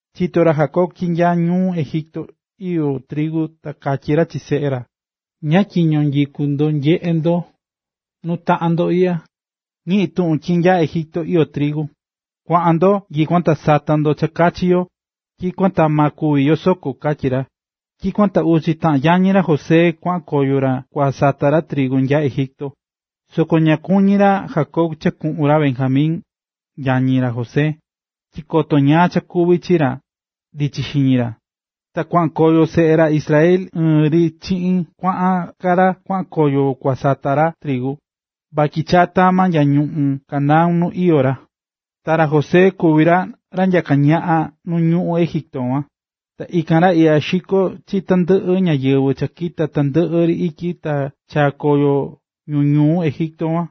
Chito̱ ra Jacob tyi nya ñuꞌún Egipto iyó trigu ta katyí ra chi seꞌe ra: “¿Ñáá tyiño nyikú ndo nyeꞌé ndo nuu taꞌan ndo iꞌya? Ñiꞌi̱n tuꞌun tyi nya Egipto iyó trigu. Kua̱ꞌan ndo nyikuan ta sata ndo cha kachi yo, tyikuan ta ma kúvi yo soko”, katyí ra. Tyikuan ta uchi taꞌan yañi ra José kuaꞌan koyo ra kua sata ra trigu nya Egipto. Soko ña kuñí ra Jacob cha kuꞌun ra Benjamin, yañi ra José, tyi koto ñáá cha kuvi chi ra, ndichí xiñi ra. Ta kuaꞌan koyo seꞌe ra Israel ɨɨn ri chiꞌin kuaꞌa ka ra kuaꞌan koyo kua sata trigu, vatyi chaa̱ tama nya ñuꞌún Canaán nu ka iyó ra. Ta ra José kuví ra ra nyaká ñaꞌan ñuꞌún Egipto kuan, ta ikan ra ikan xikó chi tandɨꞌɨ ñáyɨvɨ cha kita̱ tandɨꞌɨ ri ityi ta chaa̱ koyo ñu ñuu Egipto kuan.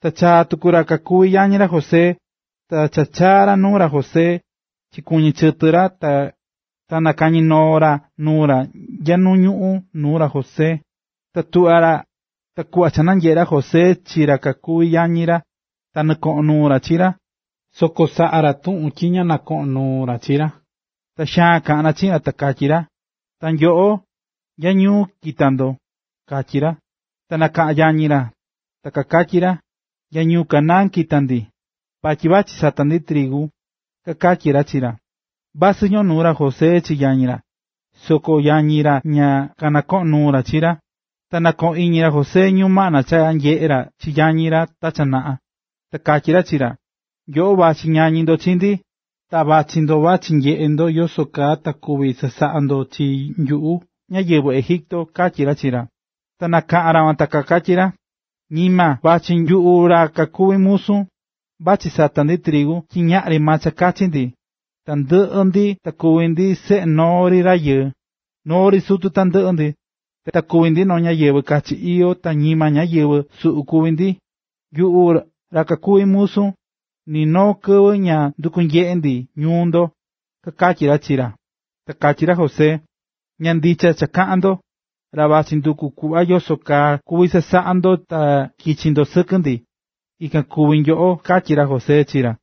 Ta chaa̱ tuku ra kakuví yañi ra José. Ta cha kachaa̱ ra nuu ra José, chikuɨñɨ̱ chɨtɨ ra ta kanakañí noo ra nuu ra nya nu ñuꞌún nuu ra José. Ta kuꞌva cha nanyeꞌe̱ ra José chi ra kakuví yañi ra, ta nɨkoꞌo̱n nuu ra chi ra, soko saꞌa̱ ra tuꞌun tyi ña ñoꞌón nuu ra chi ra. Ta xaan kaꞌán ra chiꞌin ra, ta katyí ra: ―¡Ta nyoꞌo! ¿Nya ñuu kita̱ ndo? ―katyí ra. Ta kanakaꞌa̱n yañi ra, ta kakatyí ra: ―Nya ñuu Canaán kita̱ ndi, vatyi vachí sata ndi trigu ―kakatyí ra chi ra. Vasɨ nɨkoꞌo̱n nuu ra José chi yañi ra, soko yañi ra ña kanɨkoꞌón nuu ra chi ra. Ta nɨkoꞌo̱n iñi ra José ñumaꞌna cha nyeꞌe̱ ra chi yañi ra ta cha naꞌa, ta katyí ra chi ra: ―Nyoꞌo vachí ñañí ndo chi ndi, ta vachí ndo vachí nyeꞌe ndo yoso kaa ta kuví chasaꞌa ndo chi nyuꞌu ñáyɨvɨ Egipto ―katyí ra chi ra. Ta kanakaꞌa̱n ra kuan ta kakatyí ra: ―¡Ñima! Vachí nyuꞌu ra kakuví musun, vachí sata ndi trigu tyi ñaꞌri maa cha kachi ndi. Tandɨꞌɨ ndi ta kuví ndi seꞌe noo ri rayɨɨ, noo ri sutu tandɨꞌɨ ndi, ta kuví ndi noo ñáyɨvɨ kachi iyó ta ñima ñáyɨvɨ suꞌu kuví ndi. Nyuꞌu ra kakuví musun, ni noo kɨvɨ ña ndukú nyeꞌe ndi ñuu ndo ―kakatyí ra chi ra. Ta katyí ra José: ―Ña ndicha cha kaꞌán ndo, ra vachí nduku kuꞌva yoso kaa kuvi chasaꞌa ndo ta kichi ndo sɨkɨ ndi, ikan kuví nyoꞌo ―katyí ra José chi ra.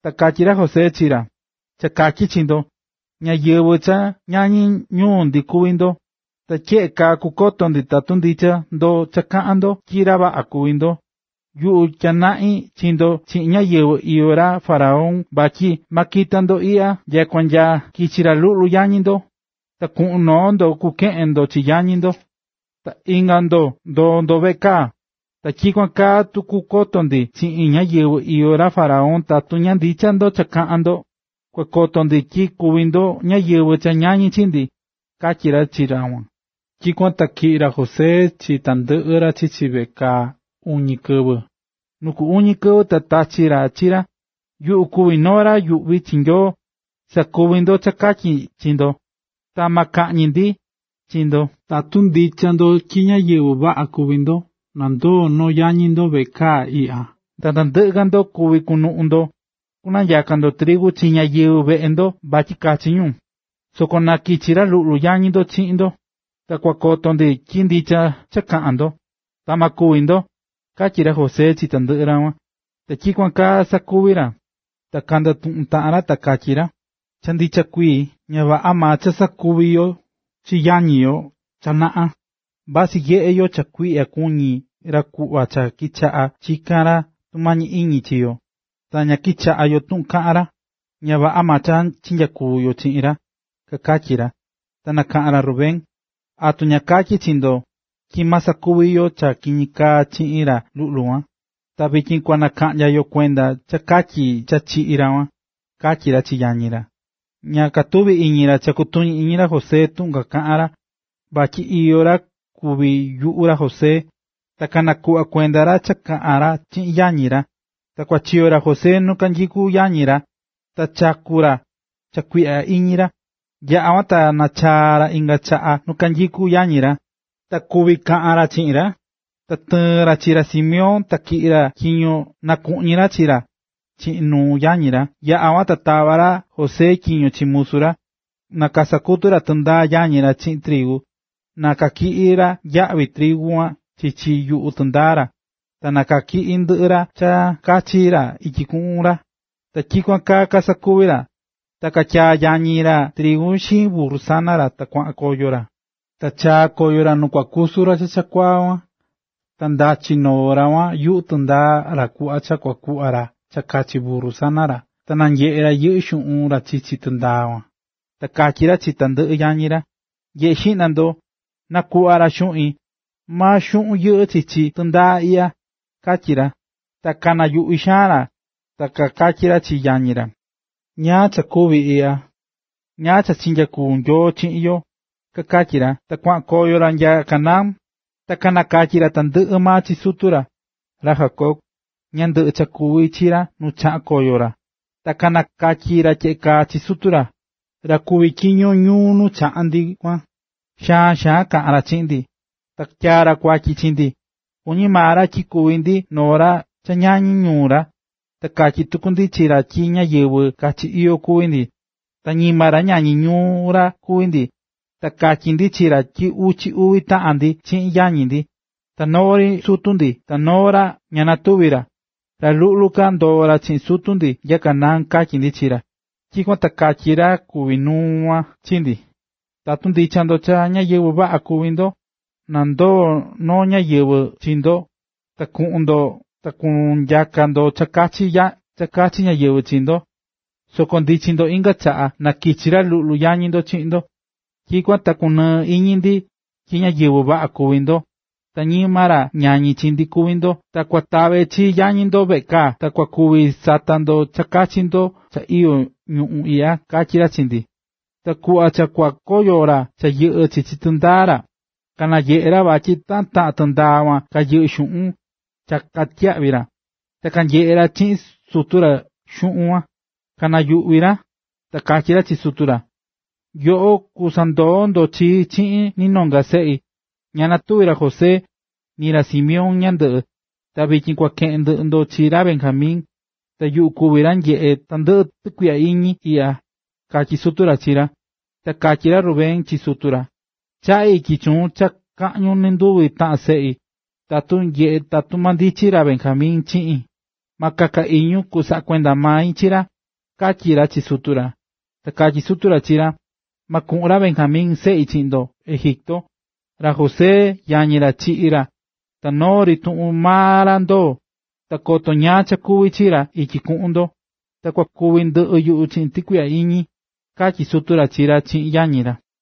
Ta katyí ra José chi ra: ―Cha katyí chi ndo, ñáyɨvɨ cha ñañí ñuu ndi kuví ndo. Ta tyeꞌe kaa kukoto ndi tatu ndicha ndo cha kaꞌán ndo tyi ra vaꞌa kuví ndo. Yuꞌu tyanaꞌín chi ndo chiꞌin ñayɨvɨ̱ iyó ra faraón vatyi ¡ma kita ndo iꞌya nyakua nya kichi nyaka ndo chi ra luꞌlu yañi ndo! Na kuꞌun noo ndo kukeꞌen chi yañi ndo, ta inga ndo ndoo ndo veꞌe kaa. Ta tyikuan kaa ta kukoto ndi chiꞌin ñayɨvɨ̱ iyó ra faraón tatu ndicha ndo cha kaꞌán ndo. Tatu ña ndicha ndo cha kaꞌán ndo, kua koto ndi tyi kuví ndo ñáyɨvɨ cha ñañí chi ndi ―katyí ra chi ra kuan. Tyikuan ta tyiꞌi̱ ra José chi tandɨꞌɨ ra chichi veꞌe kaa uñi kɨvɨ. Nu ku uñi kɨvɨ ta katyí ra chi ra: ―Yuꞌu kuví noo ra yuꞌví chi Nyoo. Sa̱kuvi ndo cha katyi ndi ta ma kaꞌñi ndi chi ndo. Tatu ndicha ndo tyi ñáyɨvɨ vaꞌa kuví ndo, na ndoo noo yañi ndo veꞌe kaa iꞌya, ta tandɨꞌɨ ka ndo kuví kunuꞌun ndo kunanyaka ndo trigu chi ñáyɨvɨ veꞌe ndo vatyi kachi ñu. Soko na kichi ra luꞌlu yañi ndo chiꞌin ndo, ta kua koto ndi tyi ndicha cha kaꞌa̱n ndo, ta ma kúvi ndo ―katyí ra José chi tandɨꞌɨ ra kuan. Ta tyikuan kaa kasakuvi̱ ra. Ta kandatuꞌu̱n taꞌan ra ta kakatyí ra: ―Cha ndicha kuii, ña vaꞌa maa cha sakuvi̱ yo chi yañi yo cha naꞌa. Vasɨ nyeꞌé yo cha kuiꞌya kuñí ra kuꞌva cha kichaꞌa̱ chikán ra tumañi iñi chi yo, ta ña kichaꞌa̱ yo tuꞌun kaꞌa̱n ra. Ña vaꞌa maa cha chinyakuvi̱ yo chiꞌin ra ―kakatyí ra. Ta nakaꞌa̱n ra Rubén: ―¿Atu ña katyi̱ chi ndo tyi ma sakuvi yo cha kiñi kaá chiꞌin ra luꞌlu kuan?, ta vityin kua nakaꞌnya yo kuenda cha katyi cha chiꞌi̱ ra kuan ―katyí ra chi yañi ra. Ña katuví iñi ra cha kutuñí iñi ra José tuꞌun cha kakaꞌán ra vatyi iyó ra kuví yuꞌu ra José, ta nakuꞌvá kuenda ra cha kaꞌán ra chiꞌin yañi ra. Ta kuachiyo̱ ra José nu kanyikú yañi ra, ta chaku̱ ra cha kuiꞌya iñi ra. Yaꞌa̱ kuan ta nachaá ra inga chaꞌa nu kanyikú yañi ra, ta kuví kaꞌán ra chiꞌin ra, ta tɨɨ̱n ra chi ra Simeón, ta tyiꞌi̱ ra tyiño na kuꞌñi ra chi ra chiꞌin nuu yañi ra. Yaꞌa̱ kuan, ta tava̱ ra José tyiño chi musu ra, na kasakutu ra tɨndaa yañi ra chiꞌin trigu, ta na natyiꞌi ra yaꞌvi trigu kuan chichi yuꞌu tɨndaa ra, ta na tyiꞌi ndɨꞌɨ ra cha kachi ra ityi kunuꞌun ra. Ta tyikuan kaa kasakuvi̱ ra. Ta katyaa̱ yañi ra trigu xiin burru sana ra ta kuanuꞌun koyo ra. Ta chaa̱ koyo ra nu kua kusu ra chakuaa kuan. Ta ndachi̱ noo ra kuan yuꞌu tɨndaa ra kuꞌva cha kua kuꞌva ra cha kachi burru sana ra, ta nanyeꞌe̱ ra yɨꞌɨ́ xuꞌun ra chichi tɨndaa kuan. Ta katyí ra chi tandɨꞌɨ yañi ra: ―Nye̱ꞌe xiꞌna ndo, nakuꞌva̱ ra xuꞌin, maa xuꞌun yɨꞌɨ́ chichi tɨndaa iꞌya ―katyí ra. Ta kanayuꞌvi xaan ra ta kakatyí ra chi yañi ra: ―¿Ñáá cha kuví iꞌya? ¿Ñáá cha nyakuví Nyoo chiꞌin yo? ―kakatyí ra. Ta kuaꞌan koyo ra nya Canaán, ta kanakatyi̱ ra tandɨꞌɨ maa chi sutu ra, ra Jacob, ñáá ndɨꞌɨ cha kakuvi̱ chi ra nu chaꞌa̱n koyo ra, ta kanakatyí ra tyeꞌe kaa chi sutu ra: ―Ra kuví tyiño ñuu nu chaꞌa̱n ndi kuan, xaan xaan kaꞌa̱n ra chiꞌin ndi, ta tyaa̱ ra kuatyi chi ndi, kuñí maa ra tyi kuví ndi noo ra cha kañañí ñuu ra. Ta katyi̱ tuku ndi chi ra tyi ñáyɨvɨ kachi iyó kuví ndi, ta ñima ra ñañí ñuu ra kuví ndi. Ta katyí ndi chi ra tyi uchi uvi taꞌan ndi chiꞌin yañi ndi, ta noo ri sutu ndi ta noo ra ña natuví ra, ta ra luꞌlu ka ndoo̱ ra chiꞌin sutu ndi nya Canaán, katyí ndi chi ra. Tyikuan ta katyí ra kuví nuu ñuu kuan chi ndi: “Tatu ndicha ndo cha ñáyɨvɨ vaꞌa kuví ndo, na ndoo noo yañi ndo chiꞌin, ta kuꞌun ndo ta kunyaka ndo cha kachi ñáyɨvɨ chi ndo. Soko, cha ndichi ndo inga chaꞌa, na kichi ra luꞌlu yañi ndo chiꞌin ndo. Tyikuan ta kundunɨɨ iñi yuꞌu tyi ñáyɨvɨ vaꞌa kuví ndo, ta ñima ra ñañí chi ndi kuvi ndo, ta kua tave chi yañi ndo veꞌe kaa, ta kua kuvi sata ndo cha kachi ndo cha iyó ñuu iꞌya”, katyí ra chi ndi. Ta kuꞌva cha kua kakoyo ra cha yɨꞌɨ́ chichi tɨndaa ra, kananyeꞌe̱ ra vatyi taꞌan taꞌan tɨndaa kuan kayɨꞌɨ́ xuꞌun cha katyiyaꞌvi̱ ra. Ta cha kanyeꞌé ra chiꞌin sutu ra xuꞌun kuan, kanayuꞌví ra. Ta katyí sutu ra chi ra: ―Nyoꞌo kusandoo ndo chii chiꞌin ni nonga seꞌi. Ña natuvi̱ ra José, ni ra Simeón ñandɨꞌɨ, ta vityin kua keꞌen ndɨꞌɨ ndo chi ra Benjamin. Ta yuꞌu kuví ra nyeꞌé tandɨꞌɨ tukuiꞌya iñi iꞌya ―katyí sutu ra chi ra. Ta katyí ra Rubén chi sutu ra: ―Chaꞌí ityi chuun cha kaꞌñun nɨnduvi taꞌan seꞌi, tatu tyeꞌe ta ma ndichi ra Benjamin chiꞌin. Ma kaka iñun, kusaꞌa kuenda mai chi ra ―katyí ra chi sutu ra. Ta katyí sutu ra chi ra: ―Ma kuꞌun ra Benjamin, seꞌi, chiꞌin ndo Egipto. Ra José, yañi ra, chiꞌi̱ ra. Ta noo tuꞌun maa ra ndoó, ta koto ñáá cha kuvi chi ra ityi kuꞌun ndo, ta kua kúvi ndɨꞌɨ yuꞌu chiꞌin tukuiꞌya iñi ―katyí sutu ra chi ra chiꞌin yañi ra.